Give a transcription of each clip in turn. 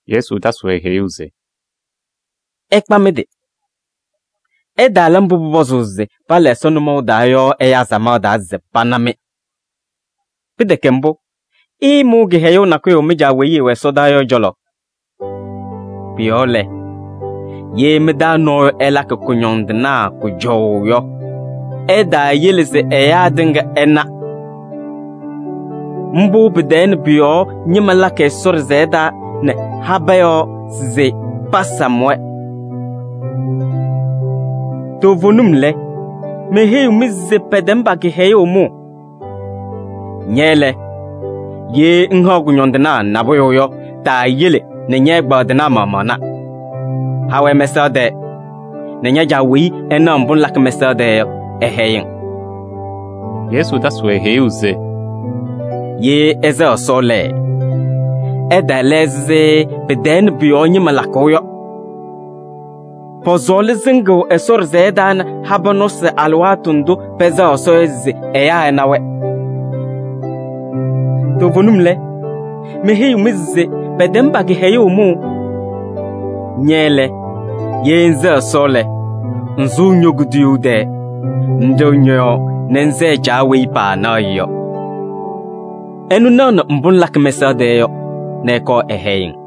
Yesu tasɩ-wɛ heyuu se: “Ɩkpa mɩ-tɩ! Ɩtaala mbʋ pʋpɔzʋʋ se pala Ɛsɔ nʋmɔʋ taa yɔ ɛyaa samaɣ taa se pana-mɩ. Pɩtɛkɛ mbʋ, ɩɩmʋʋ kɩhɛyʋʋ nakʋyʋ mɩ-Caa weyi ɛwɛ ɛsɔdaa yɔ ɛ-cɔlɔ. “Pʋ-yɔɔ lɛ, ye mɩ-taa nɔɔyʋ ɛlakɩ kʋñɔndɩnaa kʋjɔʋ yɔ, ɛtaayele se ɛyaa tɩŋa ɩna. Mbʋ tɛɛ nɛ pʋ-yɔɔ ñɩma lakɩ Ɛsɔ ɖɩsɛyɛ taa nɛ habɛɛ yɔɔ se pasam-wɛ. Toovenim lɛ, meheyiɣ-mɩ se pɛtɛm pa-kɩhɛyʋʋ mʋʋ! Ña lɛ, ye ŋhaɣ kʋñɔndɩnaa nabʋyʋ yɔ, taayele nɛ ñɛ-ɛgbaadɩnaa maɣmaɣ na. Ha-wɛ mɛsaɣ tɛɛ nɛ ña-Caa weyi ɛnaɣ mbʋ ŋlakɩ mɛsaɣ tɛɛ yɔ, ɛhɛyɩ-ŋ.” Yesu tasɩ-wɛ heyuu se: “Ye ɩsɛɣ Ɛsɔ lɛ, ɩtaala ɛzɩ tɛɛ nɛ pʋ-yɔɔ ñɩma lakʋʋ yɔ. Pɔsɔɔlɩ sɩŋʋʋ Ɛsɔ ɖɩsɛyɛ taa nɛ habɛɛ nɔsɩ alɩwaatʋ ndʋ pɛsɛɣ Ɛsɔ yɔ se ɛyaa ɛna-wɛ. Toovenim lɛ, meheyiɣ-mɩ se pɛtɛm pa-kɩhɛyʋʋ mʋʋ! Ña lɛ, ye ŋsɛɣ Ɛsɔ lɛ, ŋsʋʋ ño-kuduyuu tɛɛ nɛ ŋɖɩɣ ñɔ-yɔɔ nɛ ŋsɛɛ Caa weyi paanaɣ-ɩ yɔ. Ɛnʋ naɣnɩ mbʋ ŋlakɩ mɛsaɣ tɛɛ yɔ nɛ ɛkɔɔ ɛhɛyɩ-ŋ.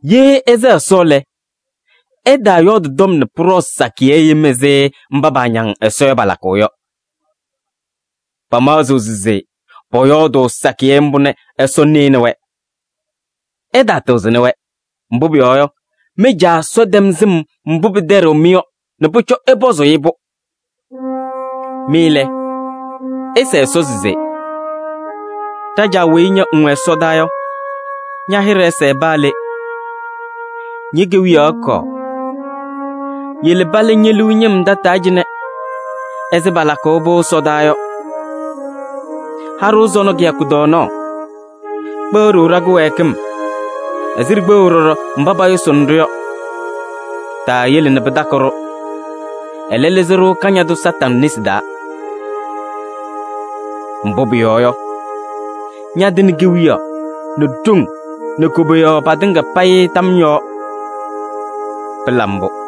“Ye ɩsɛɣ Ɛsɔ lɛ, ɩtaayɔɔdɩ tɔm nɛ pʋɖɔɔ sakɩyɛ yem ɛzɩ mba paañaŋ Ɛsɔ yɔ, palakʋʋ yɔ. Pamaɣzɩɣ se pɔyɔɔdʋʋ sakɩyɛ mbʋ nɛ Ɛsɔ nɩnɩ-wɛ. Ɩtaatɩɣzɩnɩ-wɛ, mbʋ pʋyɔɔ yɔ, mɩ-Caa Ɛsɔ tɛm sɩm mbʋ pɩtɛɖɩɣ-mɩ yɔ nɛ pʋcɔ ɩpɔzʋʋ-ɩ-pʋ. Mɩ lɛ, ɩsɛɛ Ɛsɔ se: ‘Ɖa-Caa weyi ña ŋwɛ ɛsɔdaa yɔ, ña-hɩɖɛ ɛsɛɛ paa le. Ñe-kewiyaɣ ɛkɔɔ, yele pala ñe-liu ñɩm tataa cɩnɛ ɛzɩ palakʋʋ ɛsɔdaa yɔ. Ha-ɖʋ sɔnɔ kɩyakʋ tɔɔnaɣ. Kpeɣ-ɖʋ ɖa-kɩwɛɛkɩm ɛzɩ ɖikpeɣu ɖɔɖɔ mba payʋsɩnɩ-ɖʋ yɔ. Taayele nɛ pɩtakɩ-ɖʋ, ɛlɛ, lɩzɩ-ɖʋ Kañadʋ Satanɩ nesi taa. [Mbʋ pʋyɔɔ yɔ, ñatɩnɩ kewiyaɣ nɛ ɖoŋ nɛ koboyaɣ patɩŋa payɩ tam yɔɔ. Pɩla mbʋ!]’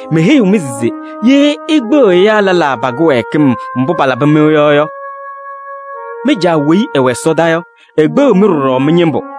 “Meheyiɣ-mɩ se: ye ikpeɣ ɛyaa lɛlaa pa-kɩwɛɛkɩm mbʋ palabɩ-mɩ yɔ yɔ, mɩ-Caa weyi ɛwɛ ɛsɔdaa yɔ, ekpeɣiɣ-mɩ ɖɔɖɔ mɩ-ñɩmbʋ.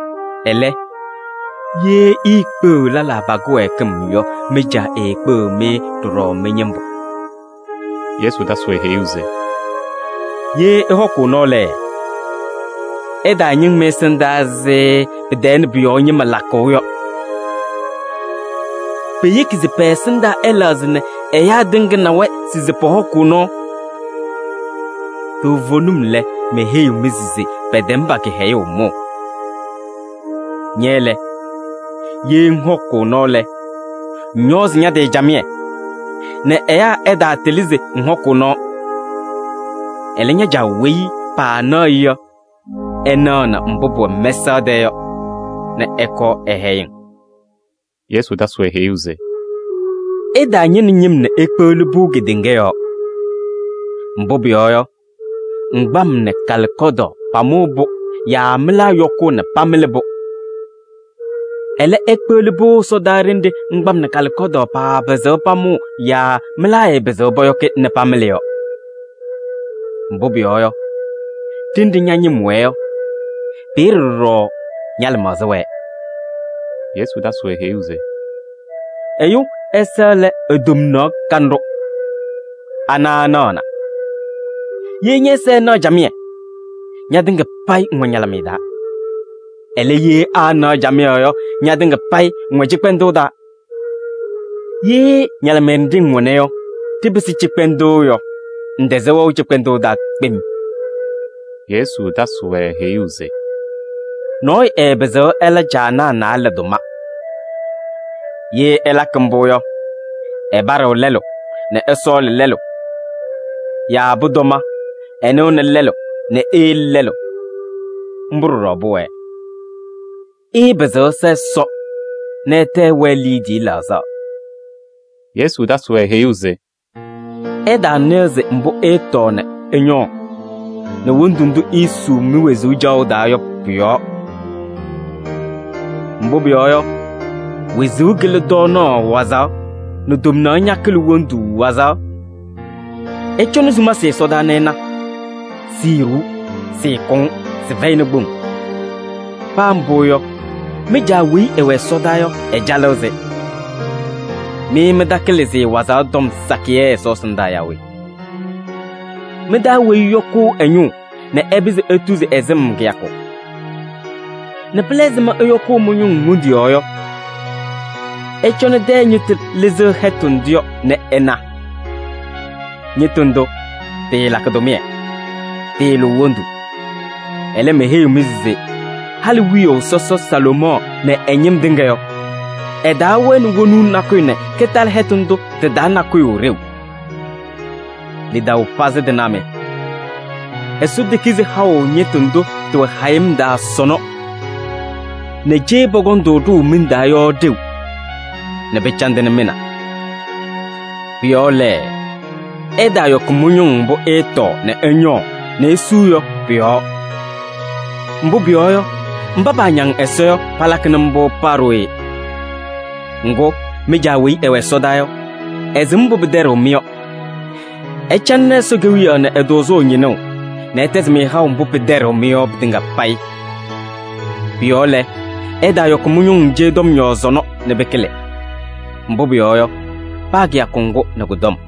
Ɛlɛ, ye iikpeɣiɣ lɛlaa pa-kɩwɛɛkɩm yɔ, mɩ-Caa eekpeɣiɣ-mɩ ɖɔɖɔ mɩ-ñɩmbʋ.” Yesu tasɩ-wɛ heyuu se: “Ye ɩhɔkʋʋ nɔɔ lɛ, ɩtaañɩŋ mɩ-ɛsɩndaa ɛzɩ tɛɛ nɛ pʋ-yɔɔ ñɩma lakʋʋ yɔ. Peyeki se pɛ-ɛsɩndaa ɛlɛɣzɩ nɛ ɛyaa tɩŋa na-wɛ se pɔhɔkʋʋ nɔɔ. Toovenim lɛ, meheyiɣ-mɩ se pɛtɛm pa-kɩhɛyʋʋ mʋʋ. Ña lɛ, ye ŋhɔkʋʋ nɔɔ lɛ, ŋñɔɔzɩ ña-tɩ camɩyɛ nɛ ɛyaa ɛtaatɩlɩ se ŋhɔkʋʋ nɔɔ. Ɛlɛ, ña-Caa weyi paanaɣ-ɩ yɔ, ɛnaɣnɩ mbʋ pʋwɛ mɛsaɣ tɛɛ yɔ nɛ ɛkɔɔ ɛhɛyɩ-ŋ.” Yesu tasɩ-wɛ heyuu se: “Ɩtaañɩnɩ ñɩm nɛ ikpeɣli-pʋ kedeŋa yɔɔ. Mbʋ pʋyɔɔ yɔ, ŋgbam nɛ kalɩkɔdaɣ pamʋʋ-pʋ yaa mɩlaa yɔkʋʋ nɛ pamɩlɩ-pʋ. Ɛlɛ, ikpeɣli-pʋ ɛsɔdaa ɖenɖe ŋgbam nɛ kalɩkɔdaɣ paapɩzɩɣ pamʋʋ yaa mɩlaa ɛɛpɩzɩɣ pɔyɔkɩ nɛ pamɩlɩ yɔ. Mbʋ pʋyɔɔ yɔ, ɖenɖe ña-ñɩm wɛɛ yɔ, peeye ɖɔɖɔ ña-lɩmaɣza wɛɛ.” Yesu tasɩ-wɛ heyuu se: “Ɛyʋ ɛza lɛ e-tomnaɣ kanɖʋ, ana ɛnaɣna. Ye ñɛ-ɛza ɛnaɣ camɩyɛ yɔ, ñatɩŋa payɩ ŋwɛ ñalɩmɩyɛ taa. Ɛlɛ, ye aanaɣ camɩyɛ yɔ, ñatɩŋa payɩ ŋwɛ cɩkpɛndʋʋ taa. Ye ñalɩmɩyɛ nɖɩ ŋwɛna yɔ, ɖɩpɩsɩ cɩkpɛndʋʋ yɔ, ŋtɛzɩɣ wɛʋ cɩkpɛndʋʋ taa kpem.” Yesu tasɩ-wɛ heyuu se: “Nɔɔyʋ ɛɛpɩzɩɣ ɛla caanaa naalɛ tʋma. Ye ɛlakɩ mbʋ yɔ, ɛpaɖɩɣ lɛlʋ nɛ ɛsɔɔlɩ lɛlʋ. Yaa pʋtɔma, ɛnɩɣnɩ lɛlʋ nɛ eyele lɛlʋ. Mbʋ ɖɔɖɔ pʋwɛɛ: ɩɩpɩzɩɣ ɩsa Ɛsɔ nɛ ɩtɛ ɩwɛɛ liidiye laɣzaɣ.” Yesu tasɩ-wɛ heyuu se: “Ɩtaanɩɣzɩ mbʋ ɩɩtɔɔ nɛ ɩñɔɔ nɛ wondu ndʋ iisuu mi-wezuu caɣʋ taa yɔ pʋ-yɔɔ. Mbʋ pʋyɔɔ yɔ, wezuu kɩlɩ tɔɔnaɣ wazaɣ nɛ tomnaɣ ñakɩlɩ wondu wazaɣ. Ɩcɔnɩ sumasɩ ɛsɔdaa nɛ ɩna: siiɖuu, sɩɩkʋŋ. Sɩfɛyɩnɩ kpoŋ. Paa mbʋ yɔ, mɩ-Caa weyi ɛwɛ ɛsɔdaa yɔ, ɛcalɩɣ-sɩ. Mɩ mɩtakɩlɩ-sɩ wazaɣ tɔm sakɩyɛ Ɛsɔ ɛsɩndaa yaa we? Mɩ-taa weyi ɛyɔkʋʋ ɛ-ñʋʋ nɛ ɛpɩzɩ etuzi ɛ-sɩm kɩyakʋ? Nɛ pɩla ɛzɩma ɩyɔkʋʋ mɩ-ñʋŋ wondu yɔɔ yɔ? Ɩcɔnɩ tɛyɛ ñɩtʋ lɩzɩɣ hɛtʋ ndʋ yɔ nɛ ɩna. Ñɩtʋ ndʋ tɩɩlakɩ tʋmɩyɛ, tɩɩlʋʋ wondu. Ɛlɛ, meheyiɣ-mɩ se halɩ wiyaʋ sɔsɔ Salomɔɔ nɛ ɛ-ñɩm tɩŋa yɔ, ɛtaawɛnɩ wonuu nakʋyʋ nɛ kɩtalɩ hɛtʋ ndʋ tɩ-taa nakʋyʋ ɖeu. Lidaʋ pazɩ tɩnaa mɩ! Ɛsɔ tekizi haʋ ñɩtʋ ndʋ tɩwɛ hayɩm taa sɔnɔ nɛ cee pɔkɔŋ-tʋ ɖʋʋ miŋ taa yɔ ɖeu nɛ pɩcandɩnɩ mɩ na? Pʋ-yɔɔ lɛ, ɩtaayɔkɩ mɩ-ñʋŋ mbʋ ɩɩtɔɔ nɛ ɩñɔɔ nɛ isuu yɔ pʋ-yɔɔ. Mbʋ pʋyɔɔ yɔ, mba paañaŋ Ɛsɔ yɔ, palakɩnɩ mbʋ paa ɖooye. Ŋgʋ, mɩ-Caa weyi ɛwɛ ɛsɔdaa yɔ, ɛsɩm mbʋ pɩtɛɖɩɣ-mɩ yɔ. Ɩcalɩnɩ ñɩnʋʋ Ɛsɔ Kewiyaɣ nɛ ɛ-tʋʋzʋʋ nɛ ɛtɛzɩ-mɩ haʋ mbʋ pɩtɛɖɩɣ-mɩ yɔ pɩtɩŋa payɩ. Pʋ-yɔɔ lɛ, ɩtaayɔkɩ mɩ-ñʋŋ cee tɔm yɔɔ sɔnɔ nɛ pɩkɩlɩ. Mbʋ pʋyɔɔ yɔ, paa kɩyakʋ ŋgʋ nɛ kʋ-tɔm.”